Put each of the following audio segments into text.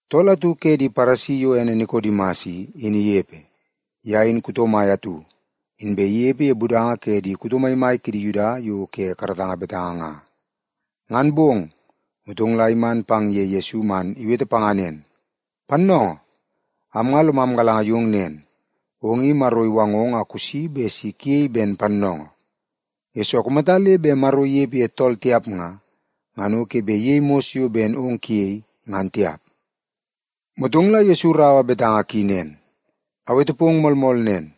Tool atu ke di Paresi yo ene Nikodimas i, in inepe. Ye in kuto mai atu, inbe inepe ye budanga ke di kuto maimai kidi Yuda yo ke karatanga betanga nga. Ngan bong, motong la iman pang ye Yesu man iwete panga nen, “Pannoongoo, am nga lomam galanga yong nen, ong i Maro iwangong a kusi bet si kuyei ben pannoongoo. Yesoo, kumata le bet Maro inepe ye tool tiap nga, ngan o ke bet iyei mos yo ben ong kuyei, ngan tiap.” Motong la Yesu iraua betanga ki nen, “Awete pong moolmool nen,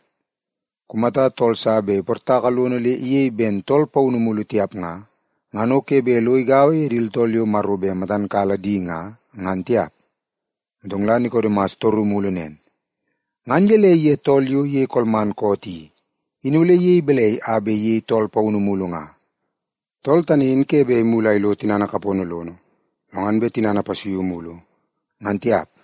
kumata tool sa bet iportaka lono le iyei ben tool paunu mulu tiap nga, ngan o ke bet lo igaua ye di tooltool yo Maro bet matan kala di nga, ngan tiap.” Motong la Nikodimas itoru mulu nen, “Ngan gelei ye tool yo iyei kolman koot i, in ole iyei balai a bet iyei tool paunu mulu nga? Tool tani in ke bet imulu a ilo tinana kapono lono, lo ngan bet tinana ipasuiu mulu, ngan tiap.”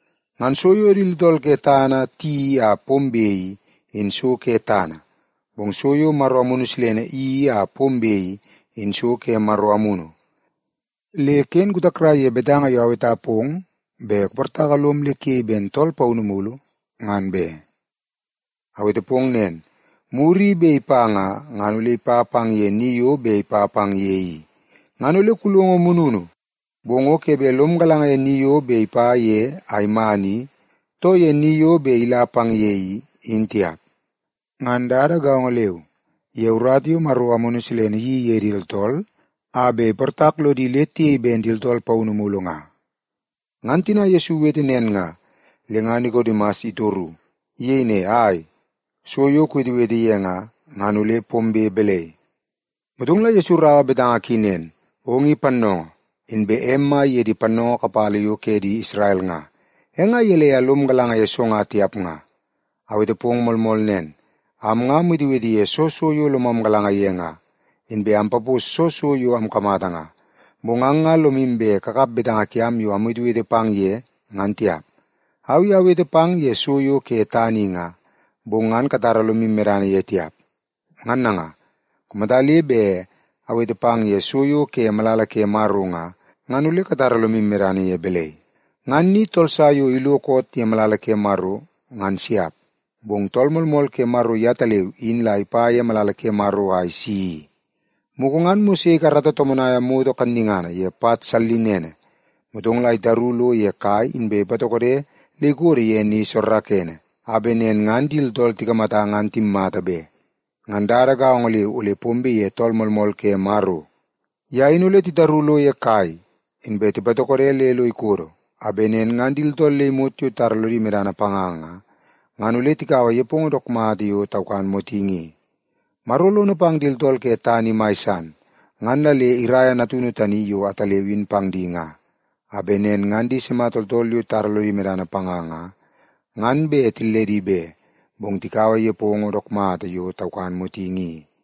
Ngan so yo di tooltool ke tana tiyeii a pombe i, in so ke tana, bong so yo Maro Amunu Silene iyeii a pombe i, in so ke Maro Amunu. Le ken kutakrai ye betanga yo aweta pong bet kuportaka lom le kuyei ben tool paunu mulu, ngan be. Awete pong nen, muru i bet ipa nga, ngan ole ipa pang ye ni yo bet ipa pang ye i. Ngan ole kulongo mununu, bong o ke bet lom galanga ye ni yo ipa ye a iman i, too ye ni yo bet ila pang ye i, in tiap. Ngan dada gaongo leu, ye urata yo Maro Amunu Silene iyeii ye di tooltool a bet iportak lodi le tiyei ben di tooltool paunu mulu nga.” Ngan tina Yesu iwete nen nga, le nga Nikodimas itoru. Iyei ne, “Ai, so yo kuwetewete ye nga, ngan ole pombe balai?” Motong la Yesu iraua betanga ki nen, “Ong i pannoongoo, inbe em mai ye di pannoongoo kapala yo ke di Isrel nga. E nga gelei a lom galanga ye so nga tiap nga? Awete pong moolmool nen, am nga amwetewete ye soo so yo lomam galanga ye nga, inbe ampapos soo so yo amkamata nga. Bong ang nga lomu bet kakap betanga kiam yo amwetewete pang ye, ngan tiap. Au i awete pang ye so yo ke tana i nga, bong ngan katara lomu medana ye tiap. Ngan nanga, kumata le bet awete pang ye so yo ke malala ke Maro nga, ngan ole katara lomu medana ye balai? Ngan ni tool sa yo ilo koot ye malala ke Maro, ngan siap. Bong Tool Moolmool ke Maro yetaleu in la ipa ye malala ke Maro a isi i. Mugu ngan Mose ikarata tomonaia moto kannungana ye pat sallinene, motong la itaru lo ye kai inbe ipatokode le ikodo ye ni soorookoonoo, a bet nen ngan di tooltool tikamata ngan timmata be. Ngan dada gaongo leu ole pombe ye Tool Moolmool ke Maro. Ye in ole titaru lo ye kai inbe tipatokode le lo ikodo, a bet nen ngan di tooltool le imot yo titara lodi medana panga nga, ngan ole tikaua nepongo dook mata yo taukan motingi i. “Maro lono pang di tooltool ke tana i mai san, ngan la le iraia Natunu tani yo ataleu in pang di nga, a bet nen ngan di sima tooltool yo titara lodi medana panga nga, ngan bet tilledi be, bong tikaua nepongo dook mata yo taukan motingi i.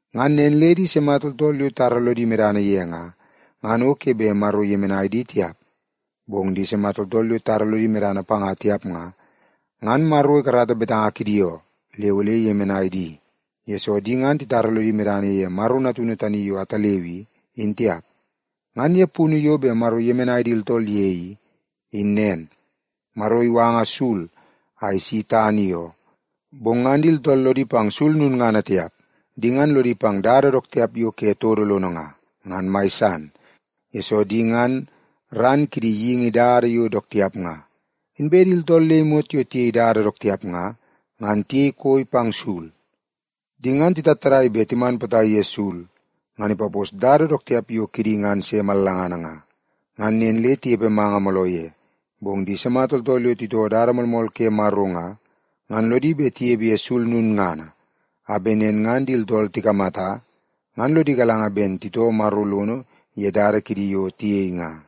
Ngan nen le di sima tooltool yo titara lodi medana ye nga, ngan o ke bet Maro iyemenai di tiap. Bong di sima tooltool yo titara lodi medana panga tiap nga, ngan Maro ikarata betanga kidi oo, le ole iyemenai di. Yesoo, di ngan titara lodi medana ye Maro Natunu tani yo ataleu i, in tiap. Ngan ye punu yo bet Maro iyemenai di tooltool ye i, in nen: Maro iwanga sul a isi tana i oo, bong ngan di tooltool lodi pang sul lulngana tiap. Di ngan lodi pang dada dook tiap yo ke todo lono nga, ngan mai san, yesoo di ngan ran kidi geingi dada yo dook tiap nga. Inbe di tooltool le imot yo tiyei dada dook tiap nga, ngan tiyei koi pang sul. Di ngan titattadai bet timan potai ye sul ngan ipapos dada dook tiap yo kidi ngan se mallangana nga, ngan nen le tinepe manga mooloo ye. Bong di sima tooltool yo titoo dada moolmool ke Maro nga, ngan lodi bet tinepe ye sul lulngana, a bet nen ngan di tooltool tikamata, ngan lodi galanga ben titoo Maro lono ye dada kidi yo tiyei nga.”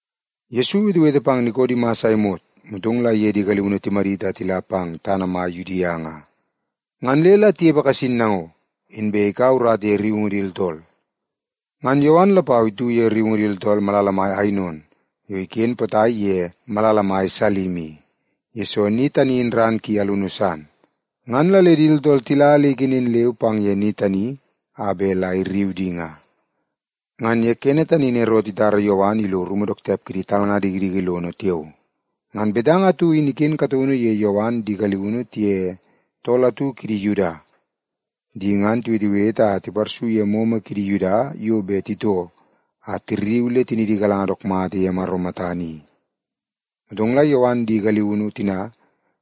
Yesu iwetewete pang Nikodimas a imot, motong la iye di galiunu timadit a tila pang tana mai Yudia nga. Ngan le la tinepe kasin nango, inbe ikaua urata ye rriungu di tooltool. Ngan Yowan lapau itu ye rriungu di tooltool ye malala Ainon yo iken potai pang ye malala mai Salim i, yesoo ni tani in ran ki alunu san. Ngan la le di tooltool tila le ikenen leu pang ye ni tani a bet la irriu di nga. (Ngan ye kene tani in Erot itara Yowan ilo rumu dook tiap kidi talnga dikidiki lono tiao.) Ngan betanga atu in iken kataunu ye Yowan di galiunu tiye tool atu kidi Yuda. Di ngan tiwetewete a tiparsu ye momo kidi Yuda yo bet titoo a tirriu le tinidi igalanga dook mata ye Maro matana i. Motong la Yowan di galiunu tina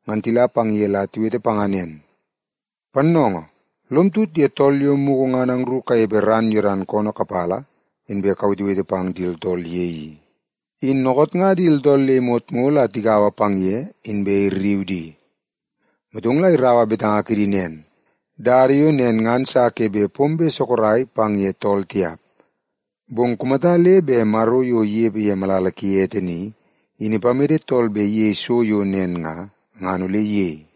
ngan tila pang ye la tiwete panga nen, “Pannoongoo, lom tut ye tool yo mugu ngan angru kanepe ran Yodan koonoo kapala, inbe kuwetewete pang di tooltool ye i, in dookoot nga di tooltool le imot ngo la tigaua pang ye, inbe irriu di.” Motong la iraua betanga kidi nen, “Dada yo nen ngan sa ke bet pombe sorok pang ye tool tiap. Bong kumata le bet Maro yo inepe ye malala ki ete ni, in ipamede tool bet iyei so yo nen nga, ngan ole iyei.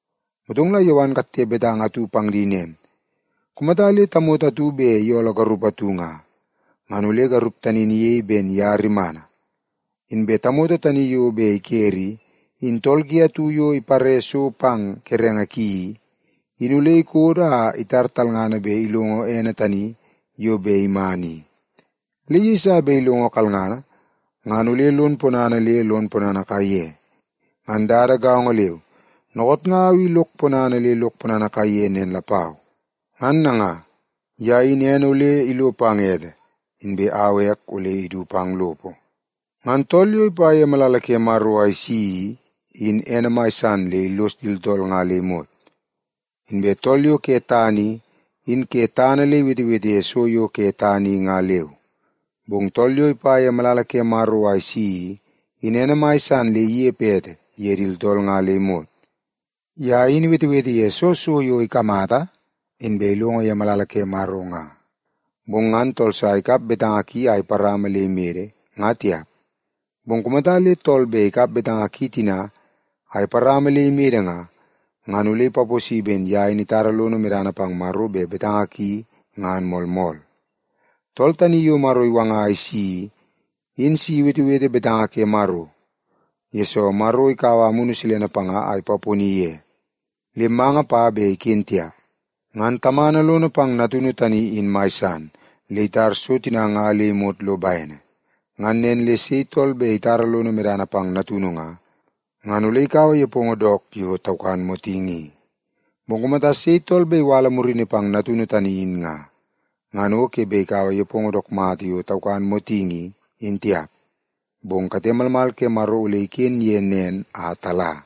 Motong la Yowan ikatte betanga atu pang di nen, “Kumata le tamoto atu bet iyooloo garup atu nga, ngan ole garup tani in iyei ben ye rimana. Inbe tamoto tani yo bet ikere i, in tool ki atu yo ipare so pang kerenge ki i, in ole ikodo a itar talngana bet ilongo ene tani yo bet iman i. Le yeiso bet ilongo kalngana, ngan ole lon ponana le lon ponana kaiye. Ngan dada gaongo leu, dookoot nga au i lok ponana le lok ponana kaiye nen lapau. Ngan nanga, ye in ene ole ilo pang ete, inbe au ek ole idu pang lopo. “Ngan tool yo ipa ye malala ke Maro a isi i, in ene mai san le illos di tooltool nga le imot. Inbe tool yo ke tana i, in ke tana le iwetewete ye so yo ke tana i nga leu. Bong tool yo ipa ye malala ke Maro a isi i, in ene mai san le inepe ete ye di tooltool nga le imot. Ye in iwetewete ye soo so yo ikamata inbe ilongo ye malala ke Maro nga. Bong ngan tool sa ikap betanga ki a iparama le imede, nga tiap. Bong kumata le tool bet ikap betanga ki tina a iparama le imede nga, ngan ole ipaposi ben ye in itara lono medana pang Maro bet betanga ki ngan moolmool. Tool tani yo Maro iwanga a isi i, in si iwetewete betanga ke Maro. Yesoo, Maro ikaua Amunu Silene panga a ipaponi ye, le manga pa bet iken tiap. Ngan Tamana lono pang Natunu tani in mai san, le itar so tina nga le imot lo bene. Ngan nen le sei tool bet itara lono medana pang Natunu nga, ngan ole ikaua nepongo dook mata yo taukan motingi i. Bong kumata sei tool bet iwala murini pang Natunu tani, in nga, ngan o ke bet ikaua nepongo dook mata yo taukan motingi i, in tiap. Bong kate malmal ke Maro ole iken ye nen a tala.”